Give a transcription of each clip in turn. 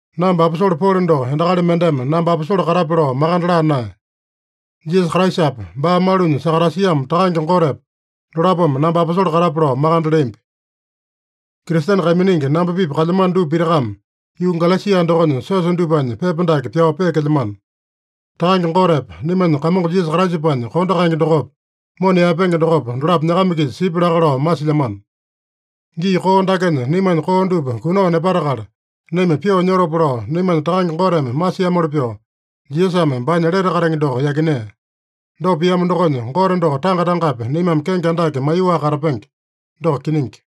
Namba aposole Polo doko endakali mendeme namba aposole katape lao makande laa naeya. Jisasa Kraisapa, baa malunya sakatasiamo Takange Gotepa, dolapome namba aposole katape lao makande leambi. Kristene kaiminingi namba-pipa kalyamano dupa pitakame yuu Galesia dokonya siosa dupanya pepa dake pyao peekelyamano. Takange Gotepa naimanya Kamongo Jisasa Kraisapanya kondo kaenge dokopa, mona yaepenge dokopa, dolapo nyakama-kisa sipya laka lao masilyamano. Gii koo dakenya naimanya koo dupa kunao nepatakala, naima pyoo nyotopa lao, naimanya Takange Goteme masiamoli pyoo, Jisasame baanya lete katenge doko yakinea. Dopa piamo dokonya, Gote doko tanga-tangapi naimame kenge andake maiyoaka katapenge. Doko kiningi.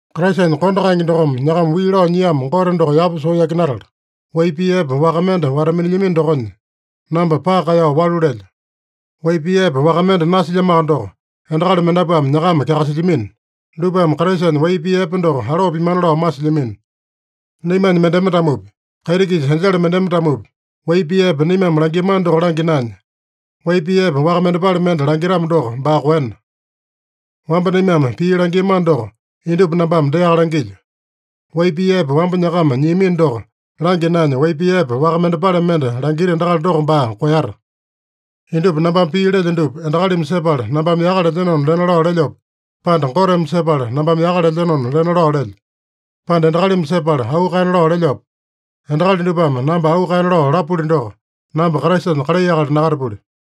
Kraisanya kondo kaenge dokome nyakama wii lao nyiamo Gote doko yapa soo yakinatala, wai pii epe waka mende wata-minilyamino dokonya, namba paka kaeyao walu lelyo. Wai pii epe waka mende nasilyamoaka doko, endakali mendapuame nyakama kyakasilyamino. Dupame Kraisanya wai pii epe doko aloo pimana lao masilyamino. Naimanya mendeme-tamopi, kaiti-kisa enjele mendeme-tamopi, wai pii epe naimame langiamano doko langya naenya, wai pii epe waka mendepale mende langitamo doko, baa koena. Wamba naimame pii langiamano doko indupa nambame deaka langilyo: Wai pii epe wamba nyakama nyiamino doko langya naenya, wai pii epe waka mendepale mende langita endakali doko baa koeyata. Indupa nambame pii lelyo dupa, endakalimi sepala nambame yaka lelyenona lena lao lelyope, pande Goteme sepala nambame yaka lelyenona lena lao lelyo? Pande endakalimi sepala auu kaena lao lelyope? Endakali dupame namba auu kaena lao lapuli doko, namba Kraisanya kalai akali nakatapuli.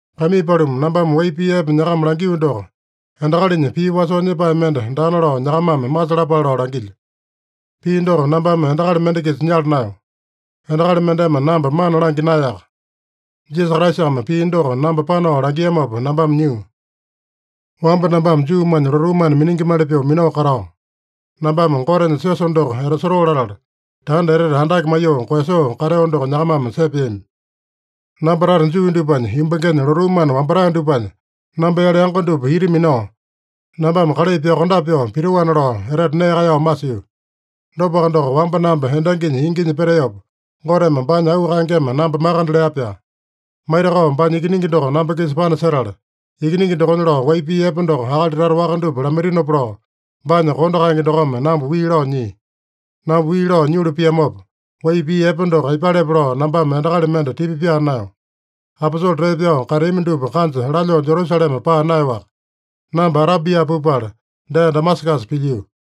Kaimii paluma, nambame wai pii epe nyakama langio doko, endakalinya pii wasoo nyepae mende daana lao nyakamame masalapale lao langilyo. Pii doko nambame endakali mende-kisa nyala naeyo. Endakali mendeme namba mana langya naeyaka. Jisasa Kraisame pii doko namba panao langiamopa nambame nyio. Wamba nambame Juumanya lotuu mana miningimali pyoo minao katao, nambame Gotenya siosa doko etasotoo latala, tanda etete andake maiyoo koeyasoo kateo doko nyakamame sepeami. Namba tata Juu dupanya yumbangenya lotuu mana wambatae dupanya, namba-yale yango dupa ita minao, nambame kalai pyokondape pyoo pitoana lao etete nee kaeyao masio. Dopaka doko, wamba namba endanginya inginya peteopa, Goteme baanya auu kaengeme namba makande lea-pyaa. Maitakao baanya Ikiningi doko namba-kisa panasetala, Ikiningi dokonya lao wai pii epe doko akali tata waka dupa lamaitinopa lao, baanya kondo kaenge dokome namba wii lao nyia. Namba wii lao nyulu piamopa, wai pii epe doko aipalepe lao nambame endakali mende tipa pyaa naeyo. Aposole tee pyao kateami dupa kanja lalyoo Jerusalema paa naeyoaka. Namba Arabia pupala, dee Damasakasa pilyio.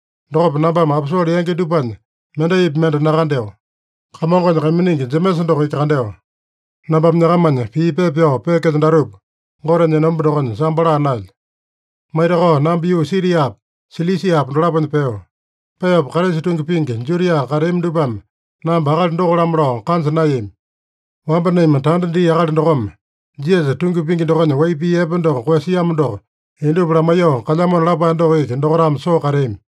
Dokopa nambame aposole yangi dupanya mendaipi mende nakandeo. Kamongonya kaiminingi Jemesa doko iki kandeo. (Nambame nyakamanya pii pepa pyao peekelyo datupa, Gotenya enomba dokonya sambo laa naelyo.) Maitakao namba yuu Siriapa, Silisiapa dolaponya peo. Peopa Kraisa tungi pingi, Judia kateami dupame namba akali doko-lamo lao kanja naeyami. “Wamba naima tanda dia akali dokome, Jisasa tungi pingi dokonya wai pii epe doko koeyasiamo doko indupa lamaiyoo kalyamona” lapae doko iki dokaitame soo kateami.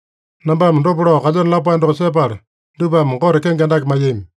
Nambame dopa lao kalyeno lapae doko sepala, dupame Gote kenge andake maiyami.